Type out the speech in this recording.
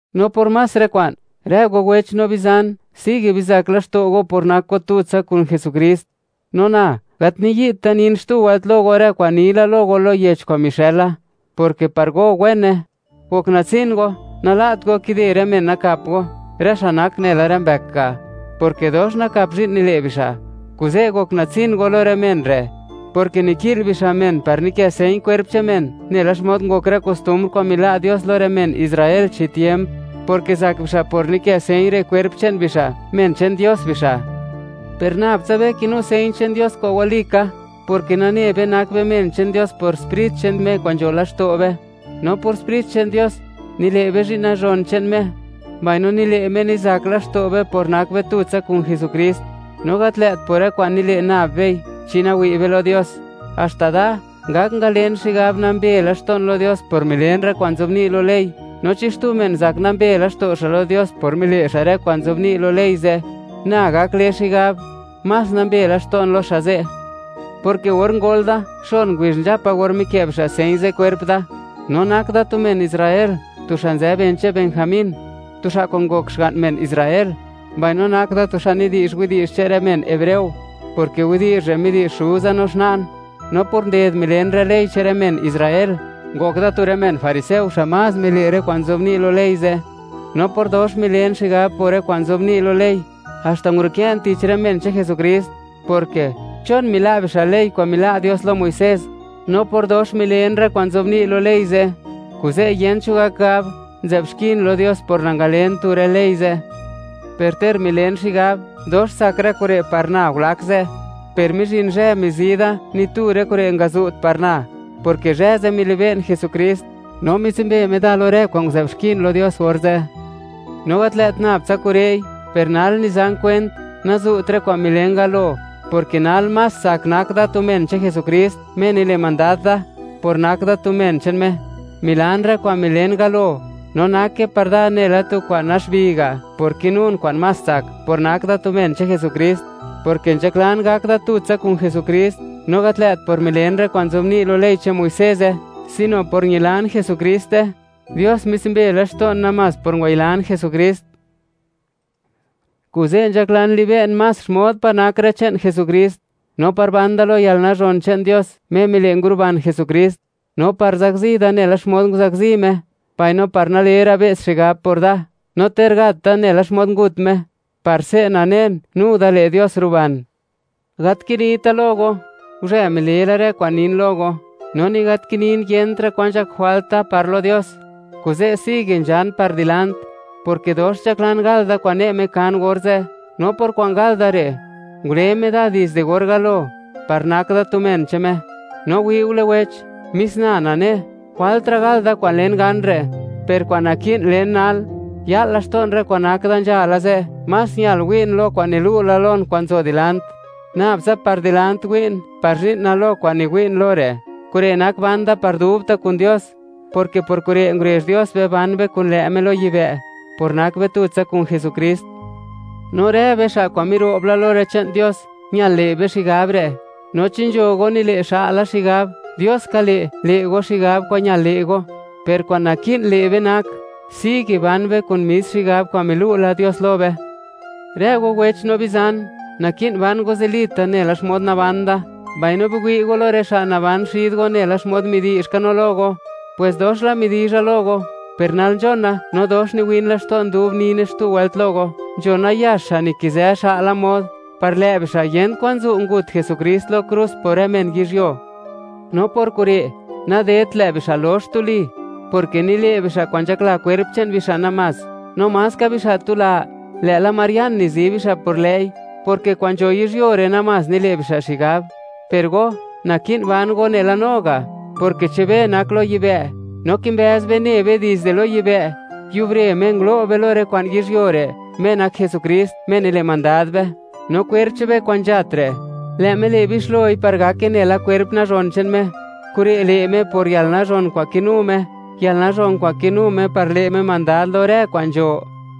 No por más rë kwa'n, rë go wech no bizan, sigue bizak laxto' go por nak go tutsa kun Jesukrist. No na, gat niyi't da nin xtu wëlt lo go, rë kwa'n ni la lo go lo yech kwa'n mixëla, porke par go, wene. Gok natsin go, nala't go kide rë men nakap go, rë xa' nak nela rë mbëk ga', porke dox nakap zhi'n nile' bixa'. Kuze', gok natsin go lo rë men re', porke niki'l bixa' men par nikë señ kwerp che'n men, nela xmod ngok rë kostumbr kwa'n mila' Dios lo rë men Israel chi tiemp, porke zak bixa' por nikë señ re' kwerp che'n bixa', men che'n Dios bixa'. Per nab tsa be kinu señ che'n Dios kwa'n walika, porke nane be, nak be men che'n Dios por Sprit che'n Me kwa'n nzho laxto' be; no por Sprit che'n Dios, nile' be zhi'n nazhon che'n Me; mbaino nile' Me, nizak laxto' be por nak be tutsa kun Jesukrist, no gat lë't por rë kwa'n nile' nab bei chi nawi' be lo Dios. Haxta da, ngak ngalen xigab, nambe laxto'n lo Dios por milen rë kwa'n nzobni' lo ley; no chi xtu men zak nambe laxto' xa' lo Dios por mile' xa' rë kwa'n nzobni' lo ley ze', na gak le xigab, más nambe laxto'n lo xa' ze', porke or ngol da, xon ngubizh nzhapa or mikë' bixa' señ ze' kwerp da. No nak da tu men Israel, tu xa' nzë ben che'n Benjamín, tu xa' kwa'n ngok xga'n men Israel. Mbaino nak da tu xa' nidi'zh widi'zh che'n rë men hebreo, porke widi'zh re' midi'zh xuza no xna'n. No por nded milen rë ley che'n rë men Israel, ngok da tu rë men fariseo xa' más mile' rë kwa'n nzobni' lo ley ze'. No por dox milen xigab por rë kwa'n nzobni' lo ley, haxta ngurukë'n tich rë men che'n Jesukrist, porke, ¿chon mila' bixa' ley kwa'n mila' Dios lo Muisés? No por dox milen rë kwa'n nzobni' lo ley ze', kuze' yent cho gak gab, nzë'b xkin lo Dios por nangalen tu rë ley ze'. Per ter milen xigab, dox tsak rë kure' par na gulak ze' (nzhala ze'), per mizhin zhë mizi da, ni tu rë kure' ngazu't par na, porke zhë ze' milibe'n Jesukrist, no mitsumbe Me da lo rë kwa'n nguzë'b xkin lo Dios orze'. No gat lë't nab tsa kure'i, per nal nizan kwent, nazu't rë kwa'n milen galo, porke nal más tsak nak da tu men che'n Jesukrist, Me nile' mandad da. Por nak da tu men che'n Me, milan rë kwa'n milen galo, no nake par da nela tu kwa'n naxbi ga', por kinun kwa'n más tsak, por nak da tu men che'n Jesukrist, porke nzhaklan gak da tutsa kun Jesukrist no gat lë't por milen rë kwa'n nzobni' lo ley che'n Muiseze, sino por ñilan Jesukrist. Dios mitsumbe laxto'n namás por ngwayilan Jesukrist. Kuze' nzhaklan libe'n más xmod pa' nak rë che'n Jesukrist, no par ban da lo yalnazhon che'n Dios, Me mile', nguruban Jesukrist; no par zakzi da nela xmod nguzakzi Me, mbaino par nale ra' be's xigab por da, no ter gat da nela xmod ngut Me, par se' nanen, nu da le' Dios, ruban. Gat kinita' lo go, guzhë mile la rë kwa'n nin lo go, no ni gat kinin yentra' kwan nzhak jwalt da par lo Dios. Kuze', sigue nzhan par dilant, porke dox nzhaklan gal da kwa'n ne' Me kan orze', no por kwa'n gal da re', ngule Me da dizde or galo, par nak da tu men che'n Me. No wi'ule wech, mis na nane, jwaltra' gal da kwa'n len gan re'; per kwa'n naki'n len nal, ya'l laxto'n rë kwa'n nak da nzhala ze'; más ñal wi'n lo kwa'n nilu' la lon kwa'n nzo dilant. Nabtsa par dilant niwi'n par zhi'na lo kwa'n niwi'n lo re'; kure' nak ban da par dubta' kun Dios, porke por kure' ngurezh Dios be ban be kun lë' Me lo yibë', por nak be tutsa kun Jesukrist. No rë be xa' kwa'n miro'b la lo rë che'n Dios, ñal le' be xigab re'. No chi nzho go nile' xa'la xigab; Dios ka le', le' go xigab kwa'n ñal le' go. Per kwa'n naki'n le' be, nak, sigue ban be kun mis xigab kwa'n milu' la Dios lo be. Rë go wech no bizan, naki'n ban go zilita' nela xmod naban da, mbaino biwi' go lo rë xa' naban xid go nela xmod midi'zh ka no lo go. Pwes dox la midizha lo go, per nal nzhona no dox niwin laxto'n dub nine xtu wëlt lo go, nzho nayax xa' nikizë xa'la mod, par lë' bixa' yent kwan zu', ngut Jesukrist lo krus por rë men yizhyuo. No por kure' nadedt lë' bixa' lox tuli, porke nile' bixa' kwa'n nzhakla kwerp che'n bixa' namás, no maska bixa' tula, lë'la marian nizi bixa' por lë'i, porke kwa'n nzho yizhyuo re' namás nile' bixa' xigab. Per go, naki'n ban go nela no ga', porke che'n be nak lo yibë'; no kimbëz be ne be dizde lo yibë', yubre Me ngulo' be lo rë kwa'n yizhyuo re', Me nak Jesukrist, Me nile' mandad be. No kwerp che'n be kwa'n nzhat re', lë' Me le' bixloi par gake nela kwerp nazhon che'n Me. Kure' le' Me por yalnazhon kwa'n kinu Me, yalnazhon kwa'n kinu Me par le' Me mandad lo rë kwa'n nzho.